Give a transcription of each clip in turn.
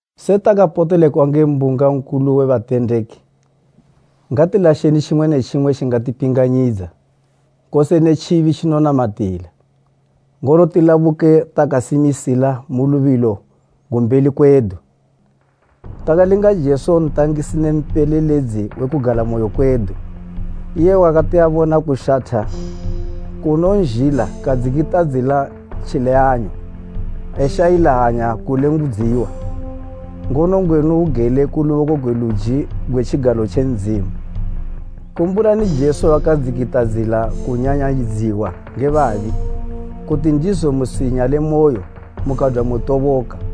Setakapotelekwa nge mbunga nkulu we batendeki, ngatilasheni tjimwe ne tjimwe tjingatipinganyidza, kose ne tjibi tjinotinamatila, ngono tilabuke takasimisila mu lubilo gu mbeli kwedu, takalinga Jesu ntangisi ne mpeleledzi we kugalamoyo kwedu, iye wakati abona kushatha kunonzhila kadzikitadzila tjileyanyo eshayila hanya kulengudziwa, ngono ngwenu ugele ku luboko gwe luji gwe tjigalo tje Ndzimu. Kumbulani Jesu wakadzikitadzila kunyanyayidziwa nge babi, kuti ndizo musinyalemoyo mukadwa mutoboka.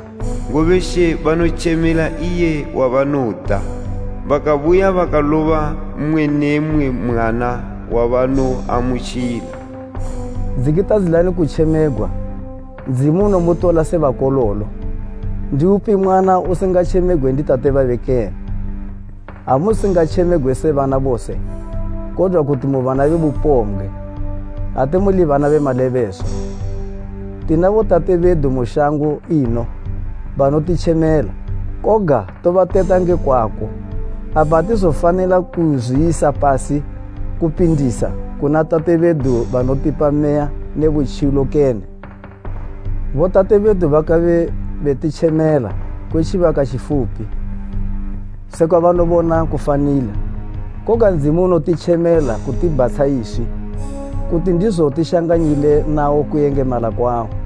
ngobe She banotjemela iye wabanoda, bakabuya bakaloba mmwe ne mmwe mwana wabanoamutjila.” Dzikitadzilani kutjemegwa, Ndzimu unomutola se bakololo. Ndiupi mwana usingatjemegwe ndi tate babe kene? Ha musingatjemegwe se bana bose, kodwa kuti mu bana be bupombgwe. Ate muli bana be malebeswa. Tina botate bedu mu shango ino banotitjemela, koga tobateta nge kwako. Apa atizofanila kuzwiyisa pasi kupindisa, kuna Tate bedu banotipa meya ne butjilo kene? Botate bedu bakabe betitjemela kwe tjibaka tjifupi, sekwa banobona kufanila, koga Ndzimu unotitjemela kutibhatsha iswi, kuti ndizo tishanganyile nawo kuyengemala kwawo.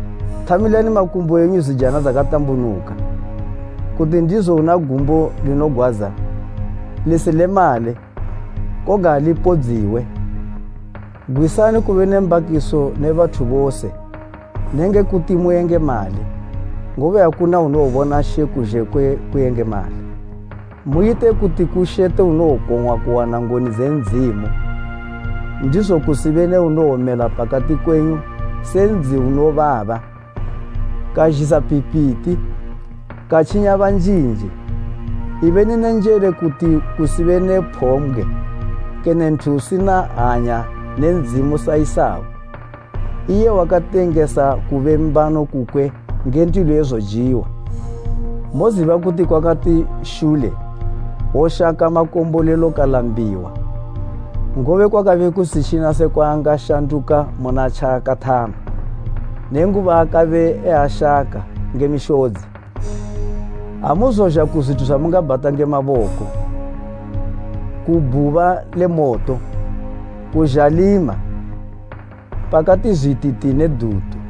“Thamilani makumbo enyu zijana dzakatambunuka,” kuti ndizo una gumbo linogwadza lisilemale, koga lipodziwe. Gwisani kube ne mbakiso ne bathu bose nenge kuti muyengemale, ngobe akuna unowobona She kuzhe kwe kuyengemala. Muyite kuti kushete unowokong'wa kuwana ngoni dze Ndzimu, ndizo kusibe ne unowomela pakati kwenyu se ndzi unobaba, kazhisa phipiti, katjinya banjinji, ibeni ne njele kuti kusibe ne phombgwe, kene nthu usina hanya ne Ndzimu sa Esau, iye wakatengesa kube mbano kukwe nge ndilo ye zojiwa. Moziba kuti kwakati shule woshaka makombolelo kalambiwa; ngobe kwakabe kusitjina sekwa angashanduka muna tjaakathama, nenguba akabe eashaka nge mishodzi. Amuzozha ku zwithu zwamungabhata nge maboko, ku bhuba le moto, ku zhalima, pakati zwititi ne dutu.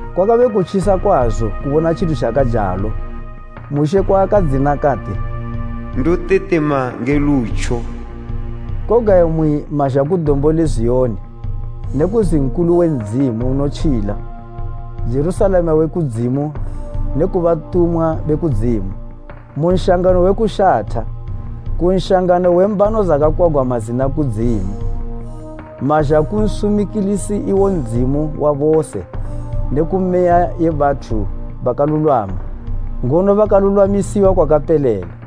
Kwakabe kutjisa kwazo kubona tjithu tjakajalo Mushe kwaakadzina kati, “Ndotetema nge lutjo.” Koga imwi mazha ku Dombo le Ziyoni ne ku nzi nkulu we Ndzimu unotjila, Jerusalema we kudzimu ne ku batumwa be kudzimu mu nshangano we kushatha, ku nshangano we mbano dzakakwagwa mazina kudzimu, mazha ku nsumikilisi iwo Ndzimu wa bose ne ku meya ye bathu bakalulwama ngono bakalulwamisiwa kwakapelela.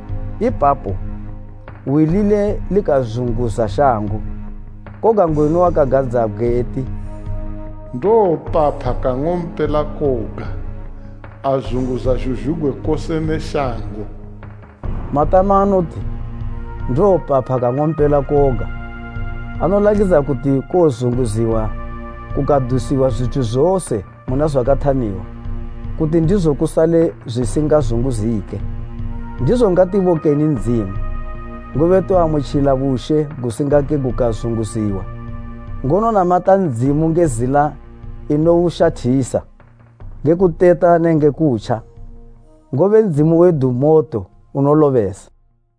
Ipapo, hwi lile likazunguza shango, koga ngwenu wakagadzabgwe eti, “Ndowopapha kang'ompela koga azunguza zhuzhugwi kose ne shango.” Matama anoti, “Ndowopapha, kang'ompela koga” anolakidza kuti kowozunguziwa kukadusiwa zwithu zose muna zwakathamiwa, kuti ndizo kusale zwisingazunguzike. Ndizo ngatibokeni Ndzimu, ngobe toamutjila bushe gusingake gukazunguziwa, ngono namata Ndzimu nge zila inoushathisa, nge kuteta nenge kutja, ngobe Ndzimu wedu moto unolobesa.